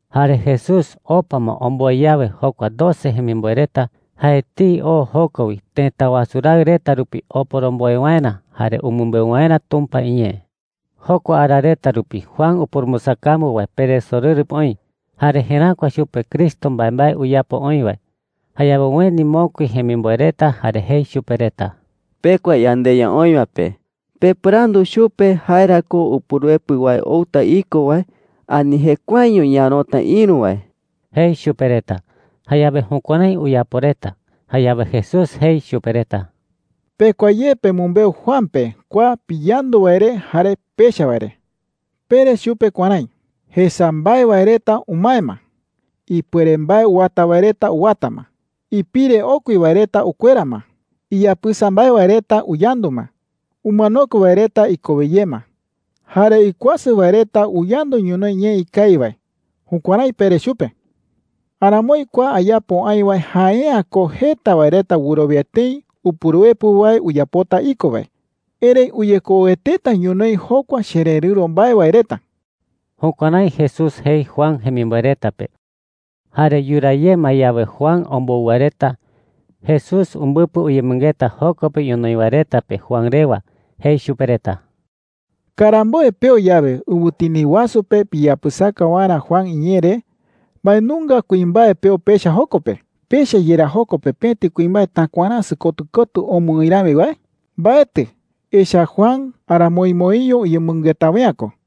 Jare Jesús opa ma omboe yawe jokua doce jemimboe reta, jae etei oo joko wi tëta wasu raɨ reta rupi oporomboe waerä jare umɨmbeu waerä Tumpa iñee. Jokua ara reta rupi Juan upurumbɨsakambu wae peresorɨru pe oï jare jeräkua chupe Cristo mbaembae uyapo oï wae. Jayawe ueni mokui jemimboe reta jare jei chupe reta: “Pekua yandeYa oï wae pe pepɨrandu chupe jae ra ko Upuruepɨ wae outa iko wae, ani jekuaeño ñaärota ïru wae,” jei chupe reta. Jayawe jukuärái uyapo reta. Jayawe Jesús jei chupe reta: “Pekua ye pemɨmbeu Juan pe kua piyandu wae re jare pecha wae re. Pere chupe kuärái: ‘Jesa mbae wae reta umae ma. Ipuere mbae uwata wae reta uwata ma. Ipire okui wae reta ukuera ma. Iyapɨsa mbae wae reta uyandu ma. Umanokue wae reta ikowe ye ma. Jare ikuasɨ wae reta uyandu ñonoï ñee ikawi wae.’ Jukuärái pere chupe,” jei chupe reta. “Aramoi kua ayapo aï wae jae’ä ko jeta wae reta wɨrowia tëi Upuruepɨ wae uyapota iko wae. Erëi uyekoueteta ñonoï jokua chererɨ̈ro mbae wae reta.” Jukuärái Jesús jei Juan jemimboe reta pe. Jare yuraa ye ma yawe Juan ombou wae reta, Jesús umbɨpɨ uyemɨngeta joko pe ñonoï wae reta pe Juan rewa. Jei chupe reta: “Karamboe peo yawe ɨwɨtini wasu pe piyapɨsaka waerä Juan iñee re, ¿mbae nunga kuimbae peo pecha joko pe? ¿Pecha yerá joko pe pëti kuimbae takuaräsɨ kotɨ kotɨ omɨ oï rami wae? Mbaetɨ. Echa’ä Juan aramoimoiño uyemɨngeta wae’ä ko,” jei.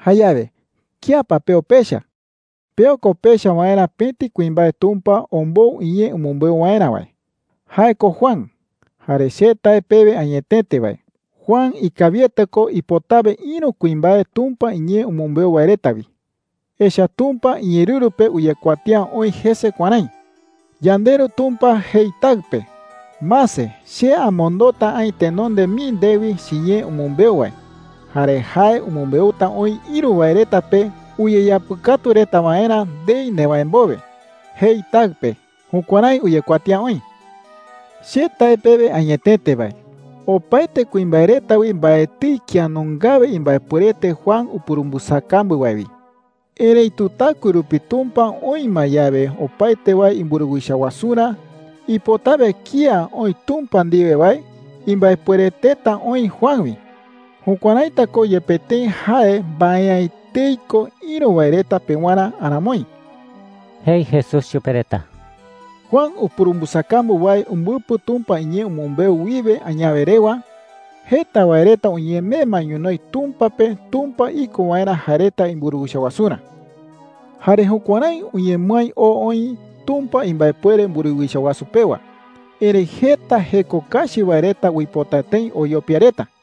“Jayawe ¿kía pa peo pecha? Peo ko pecha waerä pëti kuimbae Tumpa ombou iñee umɨmbeu waerä wae – jae ko Juan. Jare che tae pewe añetete wae, Juan ikawiete ko ipotawe ïru kuimbae Tumpa iñee umɨmbeu wae reta wi. Echa’ä Tumpa iñeerɨru pe uyekuatía oï jese kuärái: ‘YandeRu Tumpa jei Taɨ pe: ‘Mase, che amondota aï tenonde mii ndewi chiñee umɨmbeu wae. Jare jae umɨmbeuta oï ïru wae reta pe uyeyapɨkatu reta waerä ndei newäe mbowe,’ jei Taɨ pe.’ Jukuärái uyekuatía oï,” jei chupe reta. “Che tae pewe añetete wae, opaete kuimbae reta wi mbaetɨi kía nungawe imbaepuerete Juan upurumbɨsakambu wae wi. Erëitu taɨkue rupi Tumpa oï ma yawe opaete wae imburuwicha wasurä, ipotawe kía oï Tumpa ndiwe wae imbaepuereteta oï Juan wi. Jukuäraita ko, yepe tëi jae mbae’ä etei ko ïru wae reta pewarä aramoi,” jei Jesús chupe reta. “Juan upurumbɨsakambu wae umbɨpɨ Tumpa iñee umɨmbeu wiwe añawe rewa, jeta wae reta uñemee ma ñonoï Tumpa pe Tumpa iko waerä jae reta imburuwicha wasurä. Jare jukuärái uñemɨái oo oï Tumpa imbaepuere mburuwicha wasu pewa. Erëi jeta jeko kachi wae reta uipota tëi oyopia reta,” jei.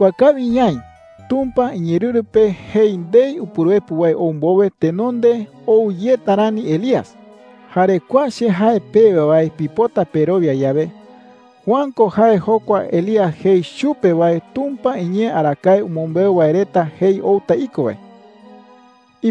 “Yaikuaa kawi ñaï, Tumpa iñeerɨru pe jei ndei Upuruepɨ wae ou mbowe tenonde ou yeta rani Elías. Jare kua che jae pewe wae pipota perowia yawe, Juan ko jae jokua Elías jei chupe wae Tumpa iñee arakae umɨmbeu wae reta jei outa iko wae,” jei.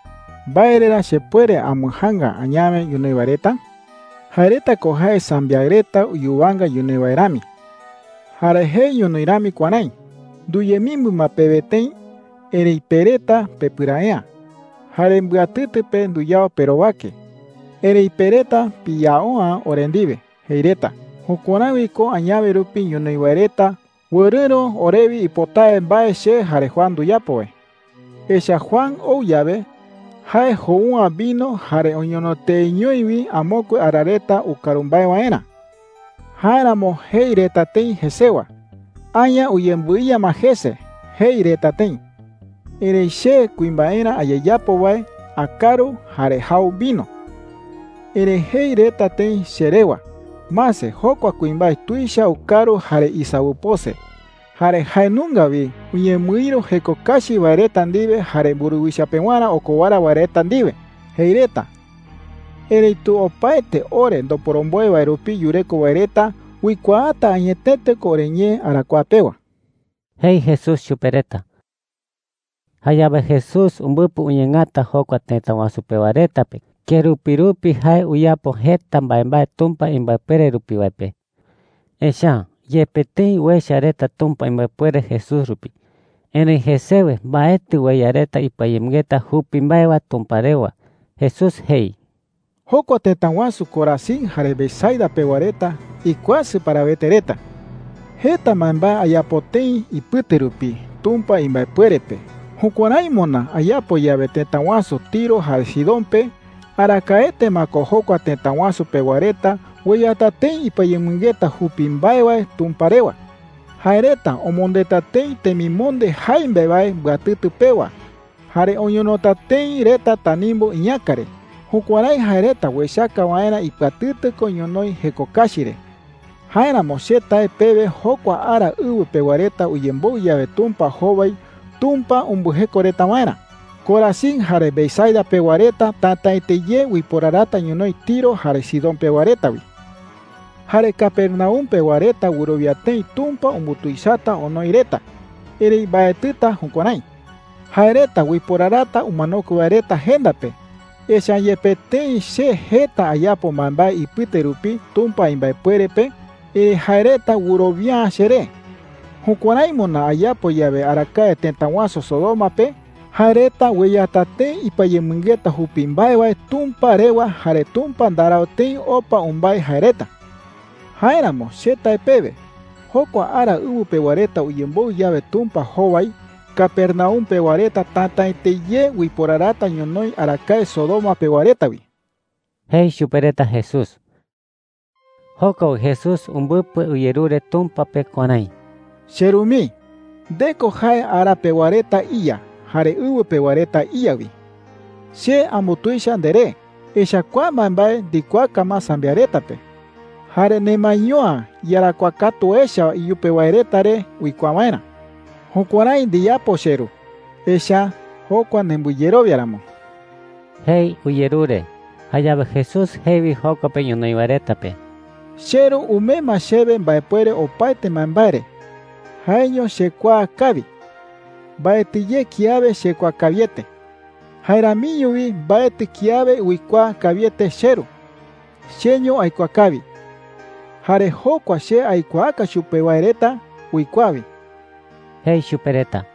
“¿Mbae re ra chepuere ambɨjaanga añawe ñonoï wae reta? Jae reta ko jae sambiaɨ reta uyuwanga ñonoï wae rami,” jei. “Jare jei ñonoï rami kuärái: ‘Nduyemimbɨ ma pewe tëi, erëi pe reta pepɨrae’ä. Jare mbɨatɨtɨ pe nduyao perowake, erëi pe reta piyao’ä ore ndiwe,’ jei reta. Jukuärái wi ko añawe rupi ñonoï wae reta wɨrɨ̈ro orewi ipotawe mbae che jare Juan nduyapo wae,” jei. “Echa’ä Juan ou yawe, jae jou’ä vino jare oñono teeñoi wi amokue ara reta ukaru mbae waerä. Jáeramo jei reta tëi jesewa: ‘Aña uyembɨiya ma jese,’ jei reta tëi. Erëi che kuimbaerä ayeyapo wae akaru jare jau vino. Erëi jei reta tëi che rewa: ‘Mase, jokua kuimbae tuicha ukaru jare isawɨpose. Jare jae nunga wi uñemɨïru jeko kachi wae reta ndiwe jare mburuwicha pewarä okowara wae reta ndiwe,’ jei reta. Erëitu opaete ore ndoporomboe wae rupi yureko wae reta uikuaata añetete ko oriñee arakuaa pewa,” jei Jesús chupe reta. Jayawe Jesús umbɨpɨ uñeengata jokua tëta wasu pewa reta pe kerupi rupi jae uyapo jeta mbaembae Tumpa imbaepuere rupi wae pe. Echa’ä yepe tëi uecha reta Tumpa imbaepuere Jesús rupi, erëi jesewe mbaetɨ ueya reta ipɨayemɨngeta jupi mbae wae Tumpa rewa. Jesús jei: “Jokua tëta wasu Corazín jare Betsaida pewa reta, ¡ikuasɨ parawete reta!” jei. “Jeta mbaembae ayapo tëi ipɨte rupi Tumpa imbaepuere pe. Jukuärái moná ayapo yawe tëta wasu Tiro jare Sidón pe, arakaete ma ko jokua tëta wasu pewa reta ueyata tëi ipɨayemɨngeta jupi mbae wae Tumpa rewa,” jei. “Jae reta omondeta tëi temimonde jaimbe wae mbɨatɨtɨ pewa jare oñonota tëi reta tanimbu iñäka re, jukuärái jae reta uechaka waerä ipɨatɨtɨ ko ñonoï jeko kachi re,” jei. “Jáeramo che tae pewe jokua ara ɨwɨ pewa reta uyemboɨ yawe Tumpa jowai Tumpa umbɨjeko reta waerä, Corazín jare Betsaida pewa reta tätaete ye uiporarata ñonoï Tiro jare Sidón pewa reta wi,” jei. “Jare Capernaum pewa reta wɨrowia tëi Tumpa umbutuichata onoi reta. Erëi mbaetɨta jukuärái,” jei. “Jae reta uiporarata umanokue wae reta jenda pe, echa’ä yepe tëi che jeta ayapo mbaembae ipɨte rupi Tumpa imbaepuere pe, erëi jae reta wɨrowia’ä cheré. Jukuärái moná ayapo yawe arakae tëta wasu Sodoma pe, jae reta ueyata tëi ipɨayemɨngeta jupi mbae wae Tumpa rewa jare Tumpa ndarau tëi opa umbái jae reta,” jei. “Jáeramo che tae pewe, jokua ara ɨwɨ pewa reta uyemboɨ yawe Tumpa jowai, Capernaum pewa reta tätaete ye uiporarata ñonoï arakae Sodoma pewa reta wi,” jei chupe reta Jesús. Joko wi Jesús umbɨpɨ uyerure Tumpa pe kuärái: “CheRu mii, nde ko jae ara pewa reta iYa jare ɨwɨ pewa reta iYa wi,” jei. “Che ambutuicha nderee, echa’ä kua mbaembae ndikuaaka ma sambiaɨ reta pe, jare nemaeño’ä iyarakuaa katu echa iyupe wae reta re uikuaa waerä,” jei. “Jukuärái ndiyapo, cheRu, echa’ä jokua nembɨyerowia ramo,” jei uyerure. Jayawe Jesús jei wi joko pe ñonoï wae reta pe: “CheRu umee ma chewe mbaepuere opaete mbaembae re. Kua ipuere uipota jei wi, “CheRu umee ma chewe arakuaa opaete mbae re.” Jaeño chekuaa kawi. Mbaetɨ ye kiawe chekuaa kawiete. Jae ramiño wi mbaetɨ kiawe uikuaa kawiete cheRu. Cheño aikuaa kawi. Jare jokua che aikuaaka chupe wae reta uikuaa wi,” jei chupe reta.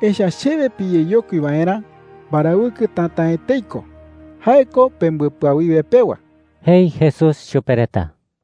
“Echa’ä chewe piyeyokui waerä, mbarawɨkɨ täta’ä etei ko. Jae ko pembɨpɨawiwe pewa,” jei Jesús chupe reta.